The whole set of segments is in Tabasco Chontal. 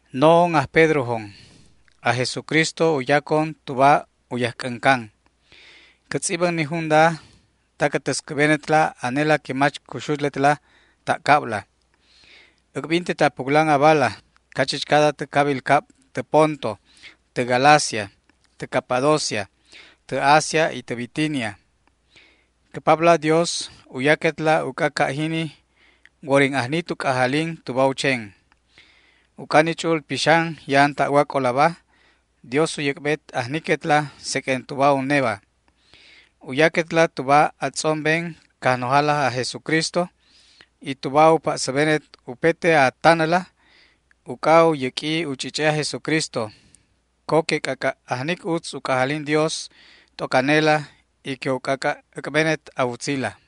No'on aj Pedrojon. Aj Jesucristo u yacon tuba u yajc'äncan. Cä tz'ibän ni junda ta cä täscäbenetla anela que mach cuxulet ta' cabla. Äc'bintet a puclan abala cachichcada tä cabil cab tä Ponto, tä Galacia, tä Capadocia, tä Asia y tä Bitinia. Cä Papla Dios u yaquetla uc'a ca' jini worin ajni tu c'ajalin tuba u chen. Uc'a ni Ch'u'ul Pixan ya'an ta'wac'olaba, Dios u yäc'bet ajniquetla seq'uen tuba uneba. U yaquetla tuba a tz'omben Cajnojala aj Jesucristo y tuba u pa'säbenet upete a tanäla uc'a u yäq'ui u ch'ich'e aj Jesucristo. Co que c'ac'a' ajnic utz u c'ajalin Dios t'oc anela y que u c'ac'a' äc'benet a wutzila.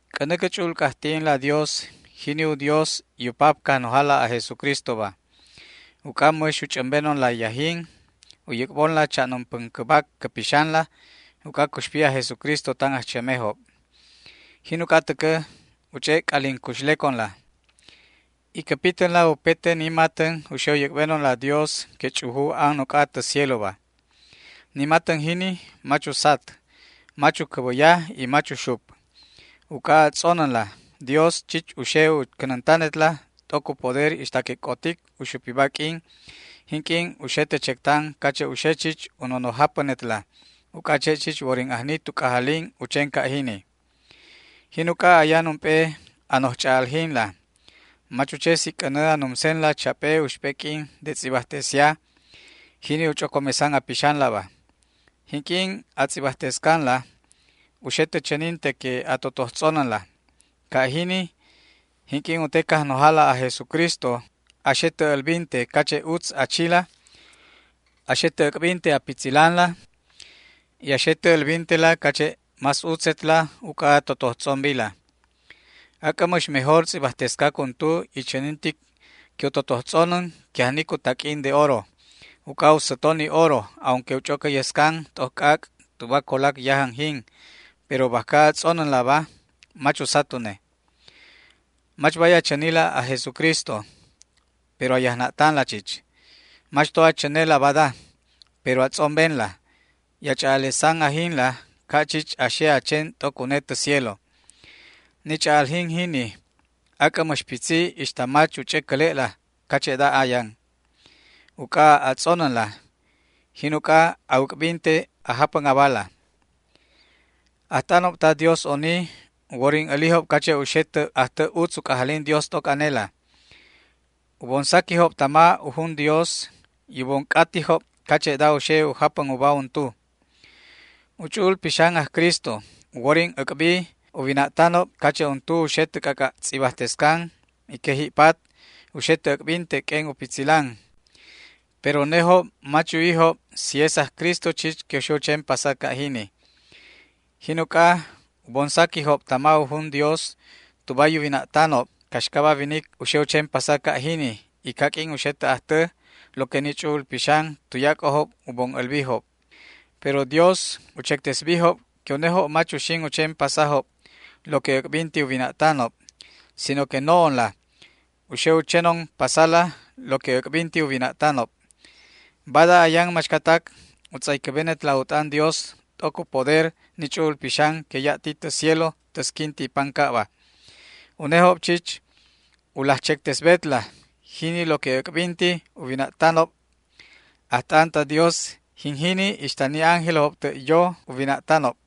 C'änä cä ch'u'ul c'ajti'inla Dios, jini u Dios y u Pap Cajnojala aj Jesucristoba. Uc'a mäx u ch'ämbenonla yajin u yäc'bonla cha'num päncäbac cä pixanla uc'a cuxpi aj Jesucristo tan ajchämejob. Jin uc'a täcä u ch'e' c'alin cuxleconla y cä pitänla upete ni matän u xe u yäc'benonla Dios que ch'uju an uc'a tä cieloba. Ni matän jini mach usat, mach u cäbäya y mach uxup. Uc'a a tz'onänla, Dios chich u xe u cänäntanetla t'oc u poder ixta que c'otic u xupiba q'uin jinq'uin u xe tä chectan cache' u xe chich u nonoj japänetla, uc'a che' chich worin ajni tu c'ajalin u chen ca' jini. Jin uc'a ayan ump'e a noj ch'a'aljinla, mach u che si c'änä a numsenla chap'e uxp'e q'uin de tz'ibajtesia, jini u ch'ocomesan a pixanlaba. Jinq'uin a tz'ibajtescanla u xe tä chäninte que a totoj tz'onänla. Ca' jini, jinq'uin u te Cajnojala aj Jesucristo a xe tä älbinte cache' utz a chila, a xe tä äc'binte a pitzilanla y a xe tä älbintela cache' más utzetla uc'a a totoj tz'ombila. Ac'ä mäx mejor tz'ibajtescac untu y chänintic que u totoj tz'onän que ajnic u taq'uin de oro, uc'a u säto ni oro aunque u ch'ocäyescan t'oc c'ac' tuba colac yajän jin, pero bajca a tz'onänlaba mach usat une. Mach bay a chänila aj Jesucristo, pero a yajna'tanla chich. Mach to a chänela bada, pero a tz'ombenla y a ch'a'alesan ajinla ca' chich a xe a chen t'oc une tä cielo. Ni ch'a'aljin jini ac'ä mäx pitzi ixta mach u ch'ä cäle'la cache'da ayan. Uc'a a tz'onänla, jin uc'a a wäc'binte a japän abala. Ajt'anob ta Dios oni u worin älijob cache' u xe tä ajtä utz u c'ajalin Dios t'oc anela. U bon saquijob tama u jun Dios y u bon c'atijob cache'da u xe u japän uba untu. U Ch'u'ul Pixan aj Cristo u worin äc'bi u wina'tanob cache' untu u xe tä c'ac'a' tz'ibajtescan y que ji'pat u xe tä äc'binte q'uen u pitzilan, pero unejob mach yuwijob si es aj Cristo chich que u xe u chen pasa ca' jini. Jin uc'a u bon saquijob tama u jun Dios tuba u wina'tanob caxcaba winic u xe u chen pasa ca' jini y caq'uin u xe tä ajtä lo que ni Ch'u'ul Pixan tuyac'ojob u bon älbijob. Pero Dios u chectesbijob que unejob mach uxin u chen pasajob lo que äc'binti u wina'tanob, sino que no'onla u xe u chenon pasala lo que äc'binti u wina'tanob. Bada ayan machcatac u tz'aycäbenetla u t'an Dios t'oc u poder ni Ch'u'ul Pixan que ya' ti tä cielo täsquinti pancabba. Unejob chich u laj chectesbetla jini lo que äc'binti u wina'tan ajt'anob ta Dios. Jin jini ixta ni ángelojob tä' yo u wina'tanob.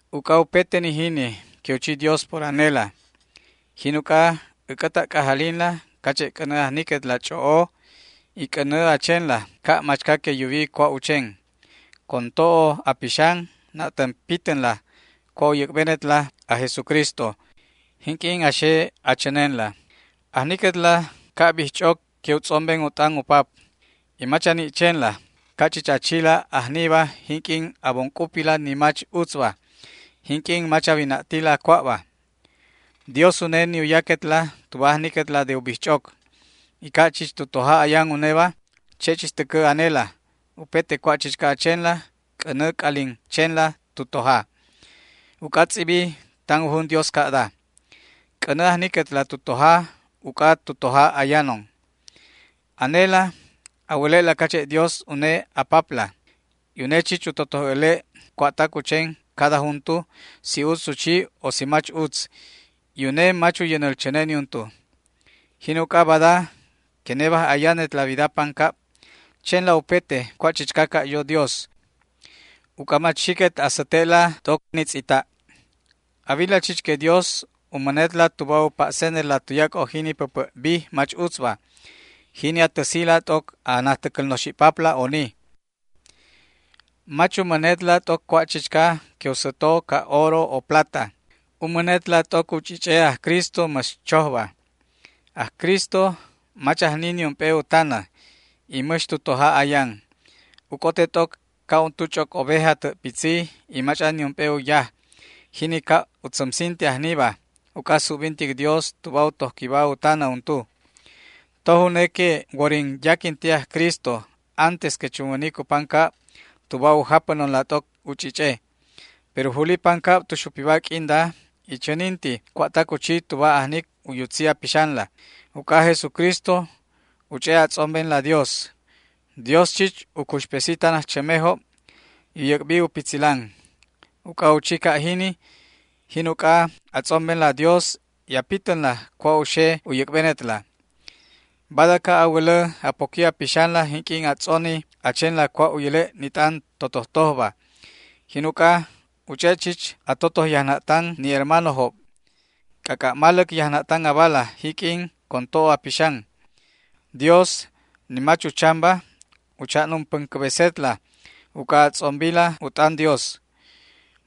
Uc'a upete ni jini que u chi Dios por anela, jin uc'a äc'ä ta' c'ajalin cache' c'änä ajniquetla ch'o'o y c'änä a chenla ca' machca que yuwi cua' u chen. Con to'o a pixan na'tän pitänla cua' u yäc'benetla aj Jesucristo jinq'uin a xe a chänenla. Ajniquetla ca' bijch'oc que u tz'omben u t'an u pap, y mach a ni' chenla ca' chich a chila ajniba jinq'uin a bon c'upila ni mach utzba, jinq'uin mach a wina'tila cua'ba. Dios une ni u yaquetla tuba ajniquetla de u bijch'oc. Y ca' chich tu toja ayan uneba, che' chich täcä anela, upete cua' chichca a chenla c'änä a c'alin chenla tu toja. Uc'a tz'ibi tan u jun Dios ca'da: “C'änä ajniquetla tu toja uc'a tu toja ayanon”. Anela a wäle'la cache' Dios une a Papla, y une chich u totoj äle' cua'tac u chen cada juntu, si utz u chi o si mach utz, y une mach u yänäl chäne niuntu. Jin uc'a, bada que nebaj ayanetla wida pancab chenla upete cua' chichca ca' yo Dios, uc'a mach xiquet a säte'la t'oc ni tz'ita'. A wila chich que Dios u mänetla tuba u pa'senetla tuyac'o jini päpä' bij mach utzba, jini a täsila t'oc a najtäcäl noxi'papla oni. Mach u mänetla t'oc cua' chichca que u säto ca' oro o plata. U mänetla t'oc u ch'ich'e aj Cristo mäx chojba. Aj Cristo mach ajni niump'e u tanä y mäx tu toja ayan. U c'ote t'oc ca' untu ch'oc oveja tä' pitzi y mach'an niump'e u yaj, jini ca' u tzämsinte ajniba uc'a subbintic Dios tuba u tojquiba u tanä untu. Toj une que worin yaquinti aj Cristo antes que chunwänic u pancab tuba u japänonla t'oc u ch'ich'e, pero juli pancab tu xupiba q'uinda y chäninti cua'tac u chi tuba ajnic u yutzi a pixanla. Uc'a aj Jesucristo u ch'e' a tz'ombenla Dios. Dios chich u cuxpesi tan ajchämejob y u yäc'bi u pitzilan. Uc'a u chi ca' jini, jin uc'a a tz'ombenla Dios y a pitänla cua' u xe u yäc'benetla. Bada ca' a wälä a poqui a pixanla jinq'uin a tz'oni a chenla cua' u yäle' ni t'an totojtojba. Jin uc'a u ch'e' chich a totoj yajna'tan ni hermanojob. C'ac'a' maläc yajna'tan abala jiq'uin con to'o a pixan. Dios, ni mach uchamba, u cha'num päncäbesetla uc'a a tz'ombila u t'an Dios.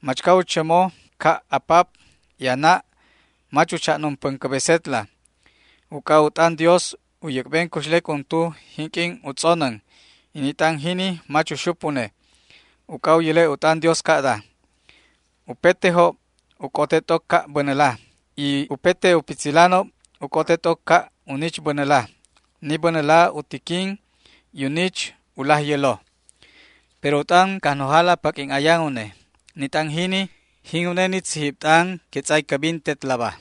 Machca u chämo ca' a pap y a na' mach u cha'num päncäbesetla. Uc'a u t'an Dios u yäc'ben cuxlec untu jinq'uin u tz'onän, y ni t'an jini mach uxup une. Uc'a u yäle' u t'an Dios ca'da: Upetejob u c'ote t'oc ca' bänäla, y upete u pitzilanob u c'ote t'oc ca' u nich bänäla. Ni bänäla u tiquin y u nich u laj yälo. Pero u t'an Cajnojala paq'uin ayan une. Ni t'an jini, jin une ni tzijib t'an que tz'aycäbintetlaba.